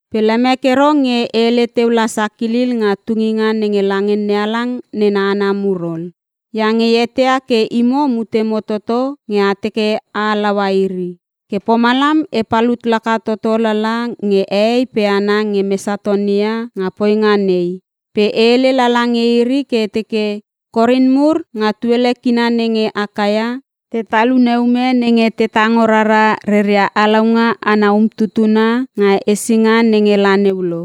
Pe lemek ero nge e hele teu la sakilil nga tunginga nenge lange NeHalang nena hana mur ol, iange e eteia ke imo mutemo toto nge a teke a halaua iri. Ke pomalam e palut laka toto lala nge hehei pe hana nge Mesatonia nga poinga nei pe e hele lala nge iri ke e teke, “Korin mur nga tuele kina nenge Akaia, te talune ume nenge te tango rara reria halaunga ana umtutuna nga hesinga nenge la neu lo.”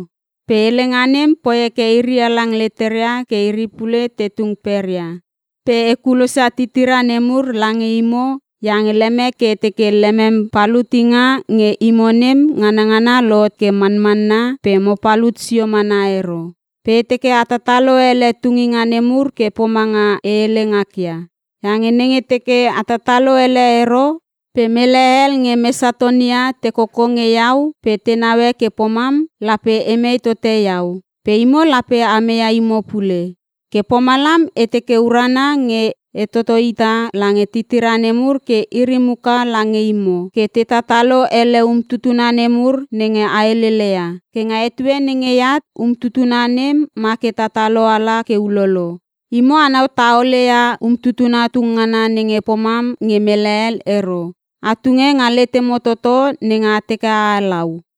Pe helenga nem poi heke iri halang leteria ke iri pule te tung peria. Pe e kulosia titira nemur lange imo iange lemek ke e teke lemem palutinga nge imo nem nganangana lohot ke manmanna pe mo palut sio mana ero. Pe e teke a tatalo ele tunginga nemur ke pomanga e hele ngakia. Iange nenge teke a tatalo ele ero pe mele hel nge Mesatonia te koko nge iau pe te naue ke pomam, lape emei tote iau pe imo lape a meia imo pule. Ke pomalam e teke urana nge e toto hita lange titira nemur ke iri muka lange imo ke te tatalo ele umtutuna nemur nenge a heleleia. Ke nga etue nenge eat, umtutuna nem ma ke tatalo ala ke ulolo. Imo anau taole ia umtutuna tung ngana nenge pomam nge mele hel ero, a tunge nga letemo toto nenge a teke a halau.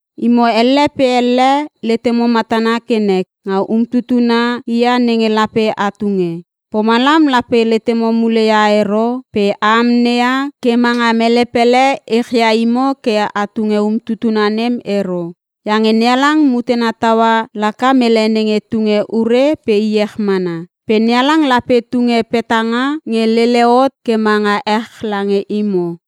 Imo elle pe elle letemo matana ke nek nga umtutuna hia nenge lape a tunge. Pomalam lape letemo mule ia ero pe a amneia ke manga mele pele echia imo ke a tunge umtutuna nem ero. Iange NeHalang mutena taua laka mele nenge tunge ure pe iech mana. Pe NeHalang lape tunge petanga nge lele hot ke manga ech lange imo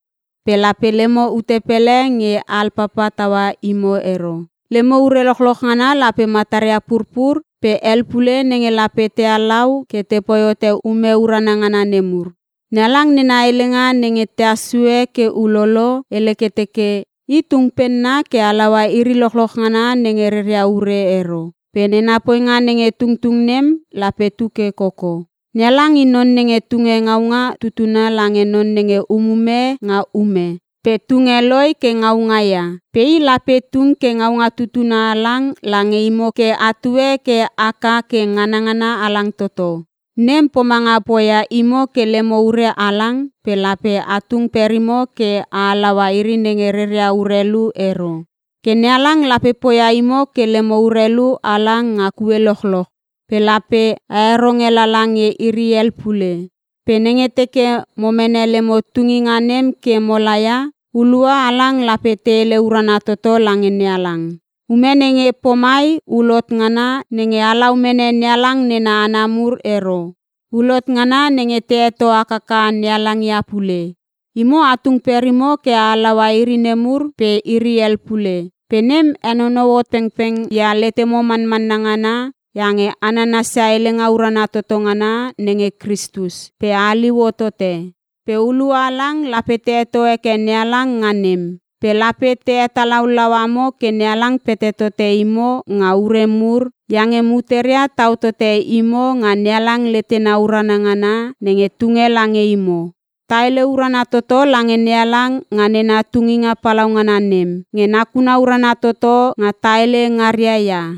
pe lape lemo ute pele nge alpapa taua imo ero. Lemo ure lochloch ngana lape mataria purpur pe hel pule nenge lape te halau ke tepoi hote ume urana ngana mur. NeHalang nena helenga nenge tehas sue ke ulolo, hele ke teke, “I tung penna ke halaua iri lochloch ngana nenge reria ure ero, pe nena poinga nenge tungtung nem lape tu ke koko.” NeHalang i non nenge tunge ngaunga tutuna lange non nenge umume nga ume pe tunge loi ke ngaunga ia. Pe i lape tung ke ngaunga tutuna halang lange imo ke atue ke haka ke nganangana halang toto. Nem pomanga poia imo ke lemo ure halang pe lape a tung perimo ke a halaua iri nenge reria urelu ero. Ke NeHalang lape poia imo ke lemo urelu halang nga kue lochloch pe lape a heronge lala nge iri hel pule. Pe nenge teke mo mene lemo tunginga nem ke mo laia, hulua halang lape te hele urana toto lange NeHalang. Ume nenge pomai hul hot ngana nenge halau mene NeHalang nena hana mur ero. Hul hot ngana nenge te heto hakaka NeHalang ia pule. Imo a tung perimo ke a halaua iri nemur pe iri hel pule. Pe nem henonou hot pengpeng ia letemo manmanna ngana iange a nanasia helenga urana toto ngana nenge Kristus pe a haliu hotote. Pe hulua halang lape te heto heke NeHalang nga nem. Pe lape te hetalaulau amo ke NeHalang pete tote imo nga ure mur iange muteria tau tote imo nga NeHalang letena urana ngana nenge tunge lange imo. Ta hele urana toto lange NeHalang nga nena tunginga palaungana nem, nge nakuna urana toto nga ta hele ngaria ia.